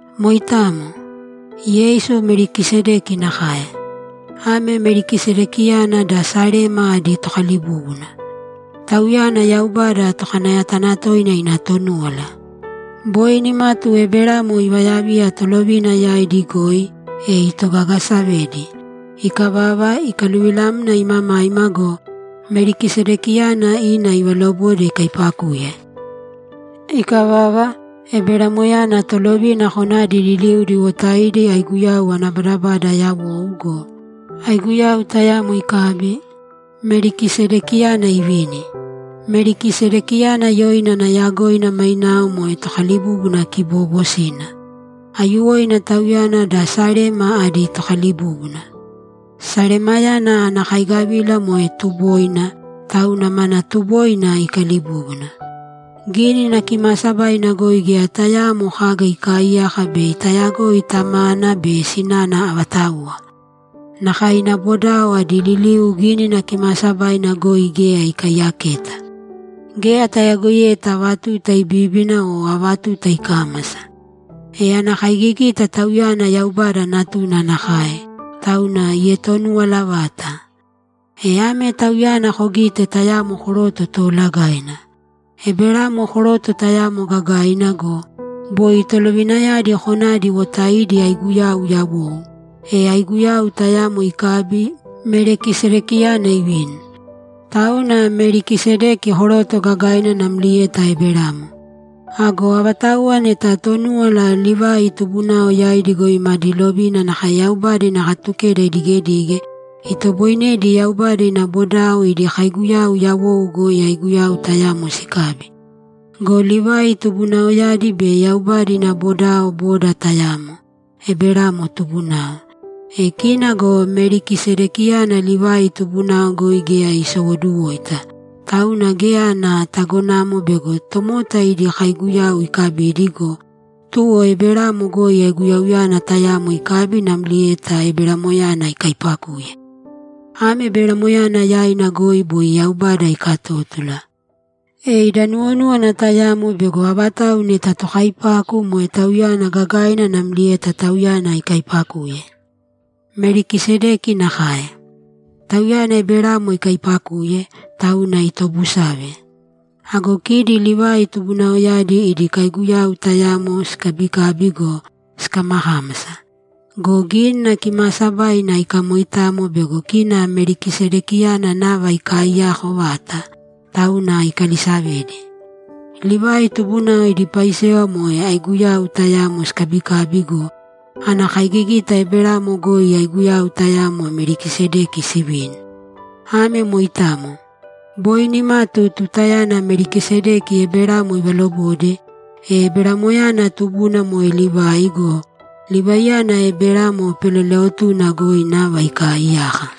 Moitamo. Yeisu Melikisedeki nakae. Ame Melikisedekiyana da Salema adi tokalibúbuna. Tauyana Yaubada Tokanayatanatoina ina Tonúwala. Boi nimatu Eberamo ivayaviya tolovina yaidi goi, e itogagasavedi. Ikavava, ikaluvilamna imamaima go, Melikisedekiyana ima ivalobode ikaipakuye. Ikavava, Eberamoyana tolovina konadi liliudi iwotaidi aiguyau ana badabada yawou go, aiguyau tayamo ikabi, Melikisedekiyana ivini. Melikisedekiyana yoina ana yagoina mainao moe tokalibúbuna kiboobosina. Aiyuwoina tauyana da Salema adi tokalibúbuna. Salemayana ana kaigavila moe tuboina, tauna mana tuboina ikalibúbuna. Gínina Kimaasabaina goi geya tayaamo kaga ikaaiyaka bei tayagoi tamana be sinana avatauwa. Nakae ina bodao adi liliu Gínina Kimaasabaina goi geya ikaiyaketa. Geya tayagoiyeta ava tuta ibíbina o ava tuta ikámasa. E ana kaigigita tauyana Yaubada Natuna nakae, tauna ietonuwala vata. E ame tauyana kogīte tayamo koroto toolagaina! Eberamo koroto tayamo gagaina go, boi tolovinayadi konadi iwotaidi aiguyau yawou, e aiguyau tayamo ikabi, Melikisedekiyana ivini. Tauna Melikisedeki koroto gagaina namlieta Eberamo. Ago avatauwa neta Tonúwala Livai tubunao yaidi goi madi lovina nakae Yaubada ina Katukeda idigedige, itoboinedi Yaubada ina bodao idi kaiguyau yawou goi aiguyau tayamo sikabi. Go Livai tubunaoyadi be Yaubada ina bodao boda tayamo, Eberamo tubunao! E kina go Melikisedekiyana Livai tubunao goi geya isowoduwoita, tauna geya ana tagonamo bego tomota idi kaiguyau ikabidi go, tuwo Eberamo goi aiguyauyana tayamo ikabi namlieta Eberamoyana ikaipakuye. Ame Eberamoyana yaina goi boi Yaubada ikatótula. E ida nuwonúwana tayamo bego avatau neta tokaipaku moe tauyana gagaina namlieta tauyana ikaipakuye. Melikisedeki nakae. Tauyana Eberamo ikaipakuye, tauna itobusave. Ago kidi Livai tubunaoyadi idi kaiguyau tayamo sikabikabi go, sikamakámasa. Go Gínina Kimaasabaina ikamoitamo bego kina Melikisedekiyana nava ikaiyako vata, tauna ikalisavedi. Livai tubunao idi paisewa moe aiguyau tayamo sikabikabi go, ana kaigigita Eberamo goi aiguyau tayamo Melikisedeki sivini. Ame moitamo. Boi nimatu tutayana Melikisedeki Eberamo ivalobode, e Eberamoyana tubuna moe Livai go, Livaiyana Eberamo peleleotuna goi nava ikaaiyaka.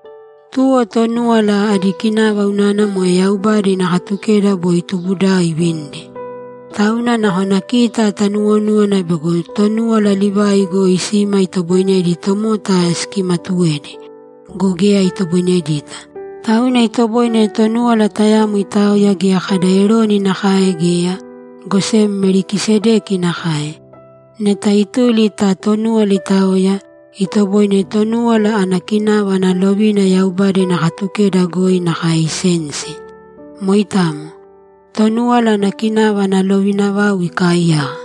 Tuwo Tonúwala adi kinava unana moe Yaubada ina Katukeda boi tubudao ivinidi. Tauna nakona kita tanuwonúwana bego Tonúwala Livai goi sima itoboinedi tomota sikimatuwedi. Go geya itoboinedita. Tauna itoboine Tonúwala tayamo itaoya geya kada Eroni nakae geya, go sem Melikisedeki nakae. Neta ituli ta Tonúwala itaoya, itoboine Tonúwala ana kinava ana lovina Yaubada ina Katukeda goi nakae isensi. Moitamo. Tonúwala ana kinava ana lovina vau ikaiyaka.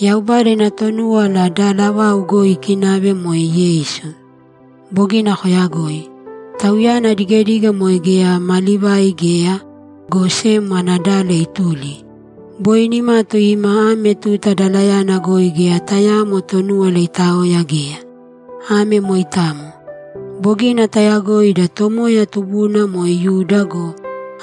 Yaubada ina Tonúwala dala vau goi ikinave moe Yeisu. Bogina koyagoi. Tauyana adigedige moe geya ma Livai geya, go sem ana dala ituli. Boi nimatu ima ame tuta dalayana goi geya tayaamo Tonúwala itaoya geya. Ame moitamo. Bogina tayagoi ida Tomoya tubuna moe Yuda go,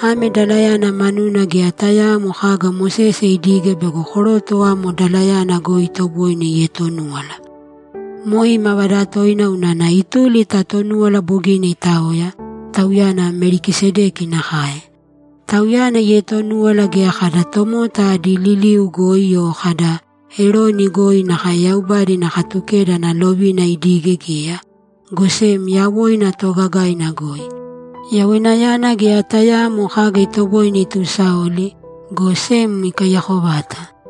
ame dalayana manuna geya tayaamo kaga Mosese idige bego koroto amo dalayana goi itoboine ietonúwala. Moe imavada toina unana ituli ta Tonúwala bogina itaoya, Tauyana Melikisedeki nakae. Tauyana ietonúwala geya kada tomota adi liliu goi o kada, ‘Eroni goi’ nakae Yaubada ina Katukeda ana lovina idige geya, go sem yawoina toogagaina goi. Yawoinayana geya tayaamo kaga itoboine itusaoli, go sem ikaiyako vata.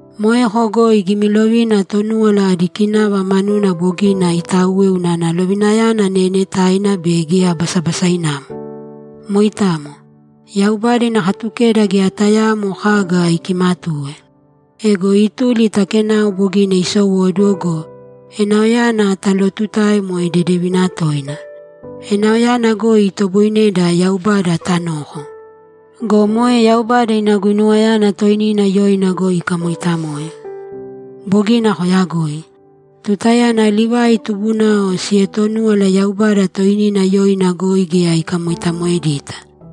Moeko goi gimilovina Tonúwala adi kinava manuna bogina itauwe unana lovinayana neenetaina be geya basabasainamo. Moitamo. Yaubada ina Katukeda geya tayaamo kaga ikimatuwe. Ego ituli ta kenao bogina isowóduwo go, enaoyana talootutae moe dedevina toina. Enaoyana goi itoboineda Yaubada tanoko. Go moe Yaubada ina guinuwayana toinina yoina goi ikamoitamoe. Bogina koyagoi. Tutayana Livai tubunao sietonúwala Yaubada toinina yoina goi geya ikamoitamoedita.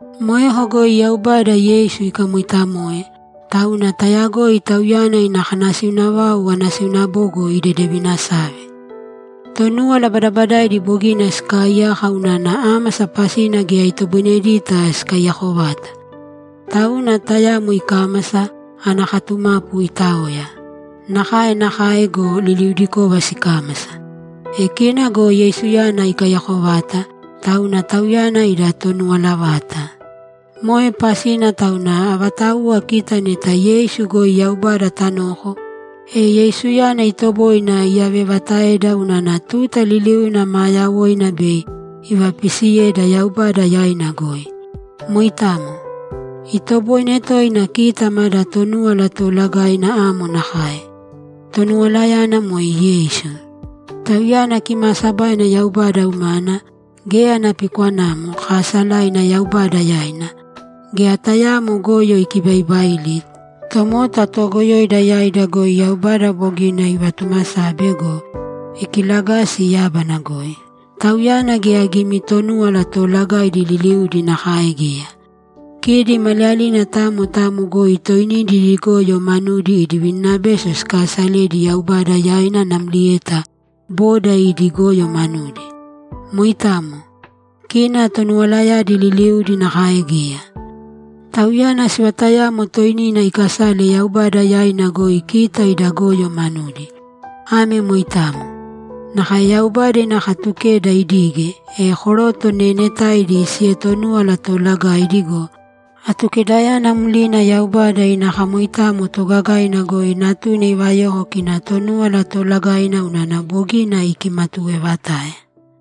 Moeko goi Yaubada Yeisu ikamoitamoe, tauna tayagoi Tauyana ina kanasiuna vau anasiuna bogo idedevinasave. Tonúwala badabadaaidi bogina sikaaiyaka unana ámasa pasina geya itoboinedita sikaiyako vata. Tauna tayamo ikámasa, ana katumapu itaoya. Nakae nakae go, liliudikova sikámasa. E kina go Yeisuyana ikaiyako vata, tauna Tauyana ida Tonuwala vata. Moe pasina tauna avatauwa kita neta Yeisu goi Yaubada tanoko, e Yeisuyana itoboine iyavevataeda unana tuta liliuna maa yawoina bei ivapiisiyeda Yaubada yaina goi. Moitamo! Itoboine toina kita mada Tonúwala Toolagaina amo nakae. Tonuwalayana moe Yeisu. Tauyana kimaasabaina Yaubada umana, geya ana pikwanamo, kaasalaina Yaubada yaina, geya tayaamo goyo ikibaibaili, tomota toogoyoida yaida goi Yaubada bogina ivatumasabe go, ikilagasi yábana goi. Tauyana geya gimi Tonúwala Toolagaidi liliudi nakae geya. Kidi maliyalina tamo tamo goi toinidi idi goyo manudi idi vininabeso sikaasaledi Yaubada yaina namlieta boda idi goyo manudi. Moitamo. Kina Tonuwalayadi liliudi nakae geya. Tauyana sivatayamo toinina ikasale Yaubada yaina goi kita ida goyo manudi. Ame moitamo. Nakae Yaubada ina Katukeda idige, e koroto neenetaidi sietonúwala toolagaidi go, Atukedayana mlina Yaubada ina kamoitamo toogagaina goi Natuna ivayoko kina Tonúwala Toolagaina unana bogina ikimatuwevatae.